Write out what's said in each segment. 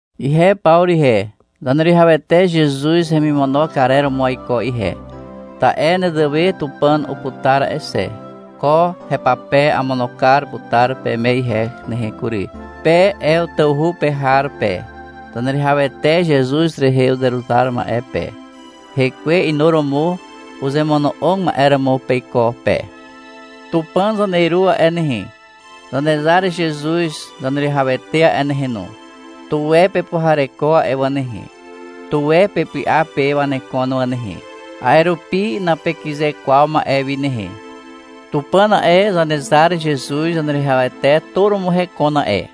Ihe Pawru ihe, Zaneruwihawete Zezuz hemimono karer romo aiko ihe, ta'e nezewe Tupàn uputar a'e xe. Ko hepape amono kar putar peme ihe nehe kury. Pe Ew tawhu pe har pe, Zaneruwihawete Zezuz rehe uzeruzar ma'e pe, hekwe inuromo uzemono'og ma'e romo peiko pe. Tupàn Zaneru a'e nehe, Zanezar Zezuz Zaneruwihawete a'e nehe no, tuwe pepuhareko a'e wà nehe. Tuwe pepy'a pe wanekon wà nehe. A'e rupi napekyze kwaw ma'e wi nehe. Tupàn a'e, Zanezar Zezuz Zaneruwihawete tu romo hekon a'e.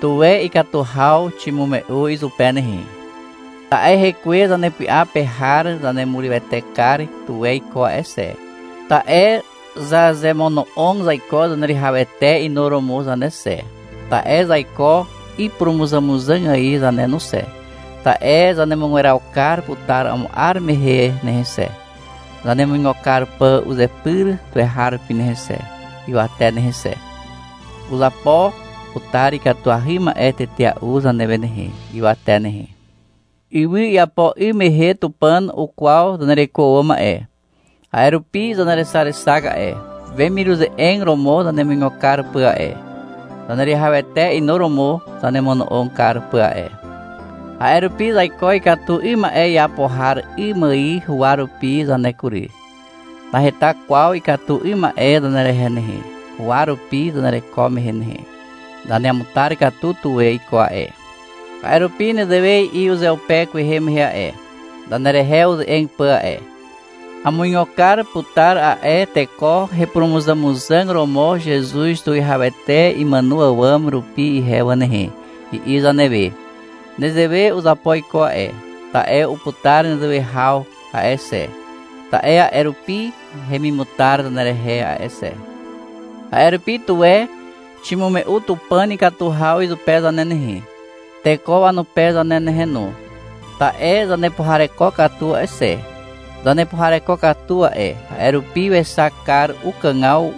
Tuwe ikatu haw ximume'u izupe nehe. Ta'e Hekwe zanepy'a pe har zanemurywete kar tuwe iko a'e xe, ta'e zazemono'og zaiko Zaneruwihawete inuromo zane xe, ta'e zaiko ipurumuzàmuzàg ài zane no xe, ta'e zanemugweraw kar putar amo 'ar mehe nehe xe, zanemuigo kar pà uzepyr tuweharupi nehe xe, ywate nehe xe. Uzapo putar ikatuahy ma'e tetea'u zanewe nehe, ywate nehe. Ywy iapo 'ym mehe Tupàn ukwaw zanereko àwàm a'e. A'e rupi zanerexarexak a'e, wemiruze'eg romo zanemuigo kar pà a'e, Zaneruwihawete inuromo zanemono'og kar pà a'e. A'e rupi zaiko ikatu 'ym ma'e iapo har 'ym ài huwa rupi zane kury. Naheta kwaw ikatu 'ym ma'e zanerehe nehe, huwa rupi zanereko mehe nehe. Zaneamutar katu tuwe iko a'e. A'e rupi nezewe i'i uzeupe kwehe mehe a'e, zanerehe uze'eg pà a'e. — Amuigo kar putar a'e teko hepurumuzàmuzàg romo Zezuz Tuwihawete imàno àwàm rupi ihe wà nehe, i'i zanewe. Nezewe uzapo iko a'e, ta'e uputar nezewe haw a'e xe, ta'e a'e rupi hemimutar zanerehe a'e xe. A'e rupi, tuwe ximume'u Tupàn ikatu haw izupe zane nehe, teko wanupe zane nehe no, ta'e zanepuhareko katu a'e xe. Zanepuhareko katu a'e, a'e rupi wexak kar ukàgaw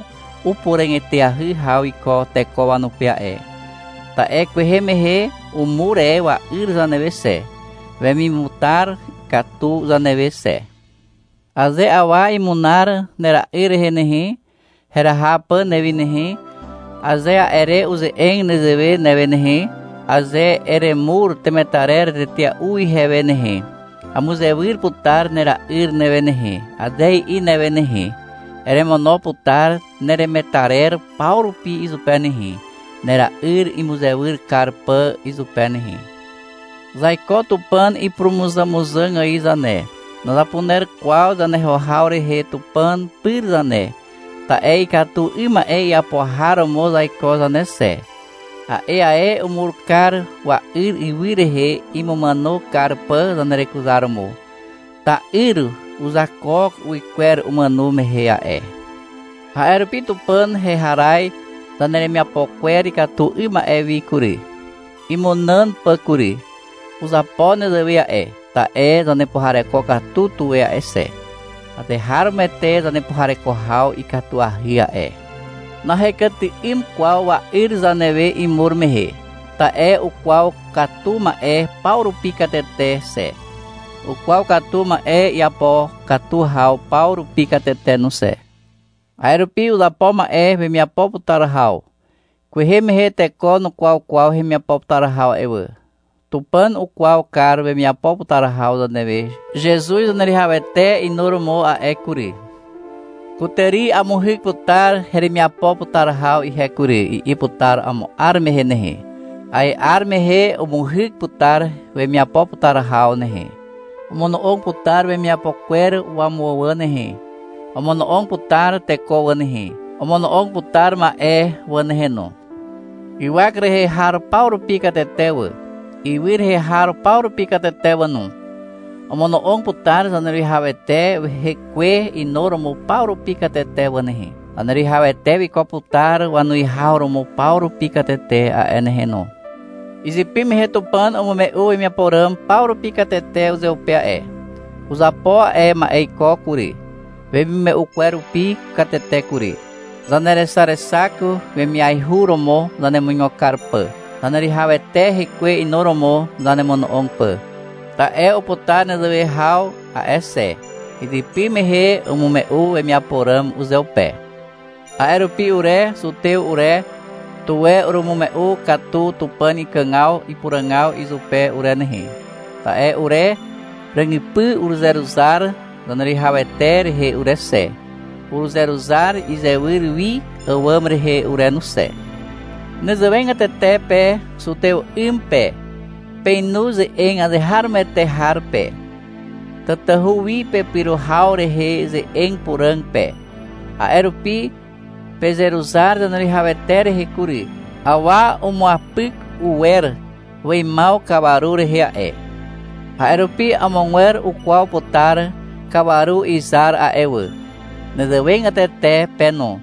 upuràg eteahy haw iko teko wanupe a'e. Ta'e kwehe mehe umur e wa'yr zanewe xe, wemiamutar katu zanewe xe. Aze awa imunar nera'yr rehe nehe, heraha pà newi nehe, aze a'e re uze'eg nezewe newe nehe, — Aze eremur temetarer tetea'u ihewe nehe, amuzewyr putar nera'yr newe nehe, aze i'i newe nehe, eremono putar neremetarer paw rupi izupe nehe, nera'yr imuzewyr kar pà izupe nehe. Zaiko Tupàn ipurumuzàmuzàg ài zane. Nazapuner kwaw zaneho haw rehe Tupàn pyr zane, ta'e ikatu 'ym ma'e iapo har romo zaiko zane xe. A'e ae umur kar wa'yr ywy rehe, imumàno kar pà zanerekuzaromo. Ta'yr uzakook uwykwer umàno mehe a'e. A'e rupi Tupàn heharaz zaneremiapo kwer ikatu 'ym ma'e wi kury, imunàn pà kury. Uzapo nezewe a'e, ta'e zanepuhareko katu tuwe a'e xe. Azeharomoete zanepuhareko haw ikatuahy a'e. Nahekyty'ym kwaw wa'yr zanewe imur mehe. Ta'e ukwaw katu ma'e paw rupi katete xe. Ukwaw katu ma'e iapo katu haw paw rupi katete no xe. A'e rupi uzapo ma'e wemiapo putar haw. Kwehe mehe teko nukwaw kwaw hemiapo putar haw a'e wà. Tupàn ukwaw kar wemiapo putar haw zanewe Zezuz Zaneruwihawete inuromo a'e kury. — Kutàri amuhyk putar heremiapo putar haw ihe kury, i'i putar amo 'ar mehe nehe. A'e 'ar mehe umuhyk putar wemiapo putar haw nehe. Omono'og putar wemiapo kwer wamuwà wà nehe. Omono'og putar teko wà nehe, omono'og putar ma'e wà nehe no. Ywak rehe har paw rupi katete wà, ywy rehe har paw rupi katete wà no. Omono'og putar Zaneruwihawete hekwe inuromo paw rupi katete wà nehe. Zaneruwihawete wiko putar wanuwihaw romo paw rupi katete a'e nehe no. Izypy mehe Tupàn umume'u wemiapo ràm paw rupi katete uzeupe a'e. Uzapo a'e ma'e iko kury, wemimume'u kwer rupi katete kury. Zanerexarexak, wemiaihu romo zanemuigo kar pà, Zaneruwihawete hekwe inuromo zanemono'og pà. Ta'e uputar nezewe haw a'e xe. Izypy mehe umume'u wemiapo ràm uzeupe. A'e rupi ure zutew ure, tuwe urumume'u katu Tupàn ikàgaw ipuràgaw izupe ure nehe, ta'e ure ràgypy uruzeruzar Zaneruwihawete rehe ure xe, uruzeruzar izewyr wi àwàm rehe ure no xe. Nezewegatete pe zutew 'ym pe. Peinu ze'eg azeharomoete har pe, tatahu wi pepyro haw rehe ze'eg puràg pe. A'e rupi pezeruzar Zaneruwihawete rehe kury. Awa umuapyk uwer weimaw kawaru rehe a'e. A'e rupi amogwer ukwaw putar kawaru izar a'e wà. Nezewegatete pe no.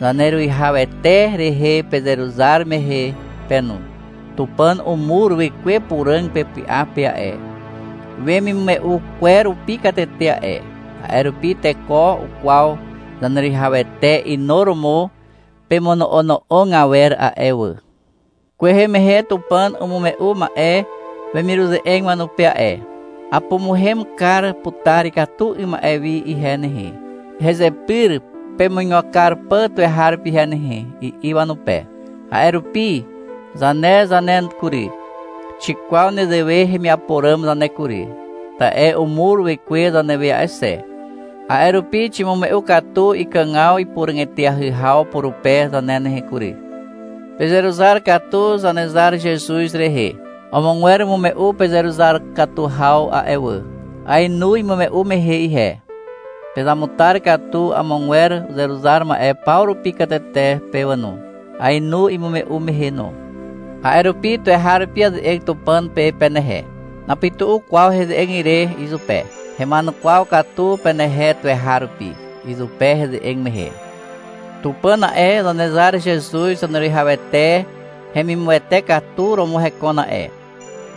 Zaneruwihawete rehe pezeruzar mehe pe no. Tupàn umur Wekwe Puràg pepy'a pe a'e, wemimume'u kwer rupi katete a'e. A'e rupi teko ukwaw Zaneruwihawete inuromo pemono'ono'og awer a'e wà. Kwehe mehe Tupàn umume'u ma'e wemiruze'eg wanupe a'e. — Apumuhem kar putar ikatu 'ym ma'e wi ihe nehe, hezepyr pemuigo kar pà tuweharupi ihe nehe, i'i wanupe. A'e rupi, zane zane kury, xikwaw nezewe hemiapo ràm zane kury, ta'e umur Wekwe zanewe a'e xe. A'e rupi ximume'u katu ikàgaw ipuràg eteahy haw purupe zane nehe kury. Pezeruzar katu Zanezar Zezuz rehe. Amogwer umume'u pezeruzar katu haw a'e wà. Aenu imume'u mehe ihe. Pezamutar katu amogwer uzeruzar ma'e paw rupi katete pe wà no. Aenu imume'u mehe no. A'e rupi tuweharupi aze'eg Tupàn pe penehe. Napytu'u kwaw heze'eg ire izupe. Hema'enukwaw katu penehe tuweharupi, izupe heze'eg mehe. Tupàn a'e, Zanezar Zezuz Zaneruwihawete hemimuwete katu romo hekon a'e,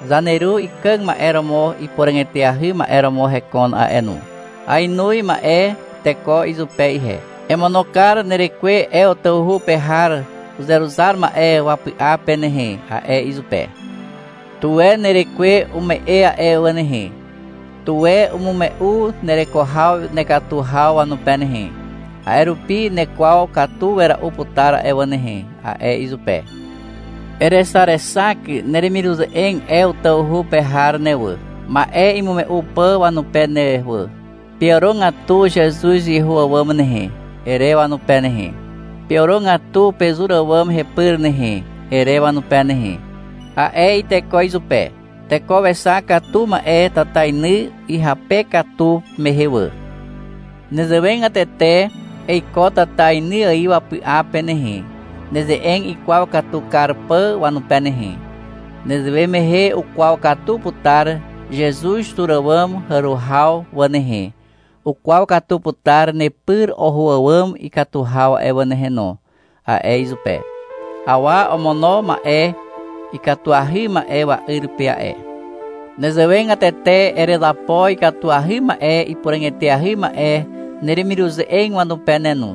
zaneru ikàg ma'e romo ipuràg eteahy ma'e romo hekon a'e no. Aenoz ma'e iteko izupe ihe. — Emono kar nerekwe Ew tawhu pe har uzeruzar ma'e wapy'a pe nehe, a'e izupe. — Tuwe nerekwe umu'e a'e wà nehe. Tuwe umume'u nereko haw nekatu haw wanupe nehe. A'e rupi nekwaw katu wera'u putar a'e wà nehe, a'e izupe. — Erexarexak neremiruze'eg Ew tawhu pe har ne wà, ma'e imume'u pà wanupe ne wà. — Peàrogatu Zezuz iho àwàm nehe, ere wanupe nehe. — Peàrogatu pezur àwàm hepyr nehe, ere wanupe nehe, a'e iteko izupe. — Teko wexak katu ma'e tatainy ihyape katu mehe wà. Nezewegatete eiko tatainy ài wapy'a pe nehe, neze'eg ikwaw katu kar pà wanupe nehe. Nezewe mehe ukwaw katu putar Zezuz tur àwàm hàro haw wà nehe. Ukwaw katu putar nepyr oho àwàm ikatu haw a'e wà nehe no, a'e izupe. — Awa omono ma'e ikatuahy ma'e wa'yr pe a'e. Nezewegatete erezapo ikatuahy ma'e ipuràg eteahy ma'e neremiruze'eg wanupe ne no.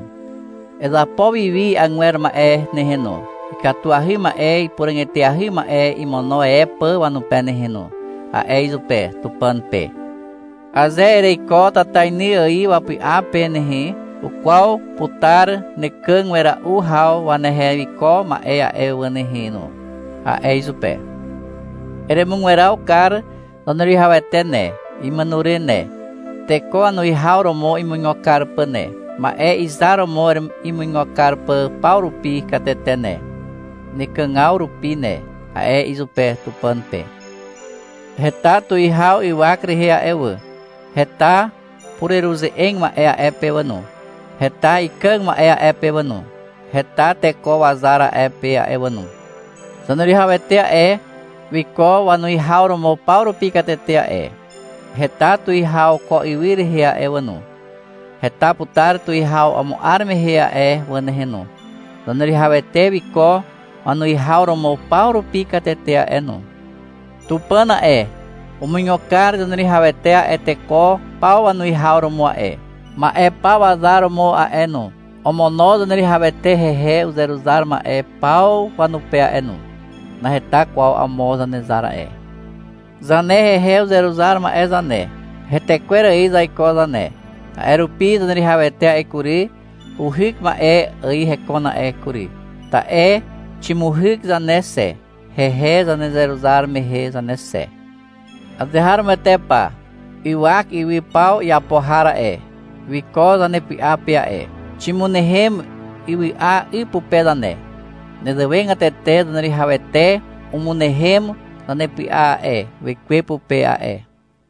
Ezapo wi wi agwer ma'e nehe no, ikatuahy ma'e ipuràg eteahy ma'e imono e pà wanupe nehe no, a'e izupe, Tupàn pe. — Aze ereiko tatainy ài wapy'a pe nehe, ukwaw putar nekàg wera'u haw wanehe wiko ma'e a'e wà nehe no, a'e izupe. — Eremugweraw kar Zaneruwihawete ne, imàno re ne, teko wanuwihaw romo imuigo kar pà ne, ma'e izar romo imuigo kar pà paw rupi katete ne, nekàgaw rupi ne, a'e izupe, Tupàn pe. Heta tuwihaw ywak rehe a'e wà. Heta pureruze'eg ma'e a'e pe wà no. Heta ikàg ma'e a'e pe wà no. Heta teko wazar a'e pe a'e wà no. Zaneruwihawete a'e, wiko wanuwihaw romo paw rupi katete a'e. Heta tuwihaw ko ywy rehe a'e wà no. Heta putar tuwihaw amo 'ar mehe a'e wà nehe no. Zaneruwihawete wiko wanuwihaw romo paw rupi katete a'e no. Tupàn a'e, umuigo kar Zaneruwihawete a'e teko paw wanuwihaw romo a'e, ma'e paw wazar romo a'e no. Omono Zaneruwihawete hehe uzeruzar ma'e paw wanupe a'e no. Naheta kwaw amo Zanezar a'e. Zane hehe uzeruzar ma'e zane, hetekwer ài zaiko zane. A'e rupi Zaneruwihawete a'e kury, uhyk ma'e ài hekon a'e kury, ta'e ximuhyk zane xe, hehe zanezeruzar mehe zane xe. Azeharomoete pa. Ywak ywy paw iapo har a'e, wiko zanepy'a pe a'e. Ximynehem ywy'a 'y pupe zane. Nezewegatete Zaneruwihawete umynehem zanepy'a a'e, Wekwe pupe a'e.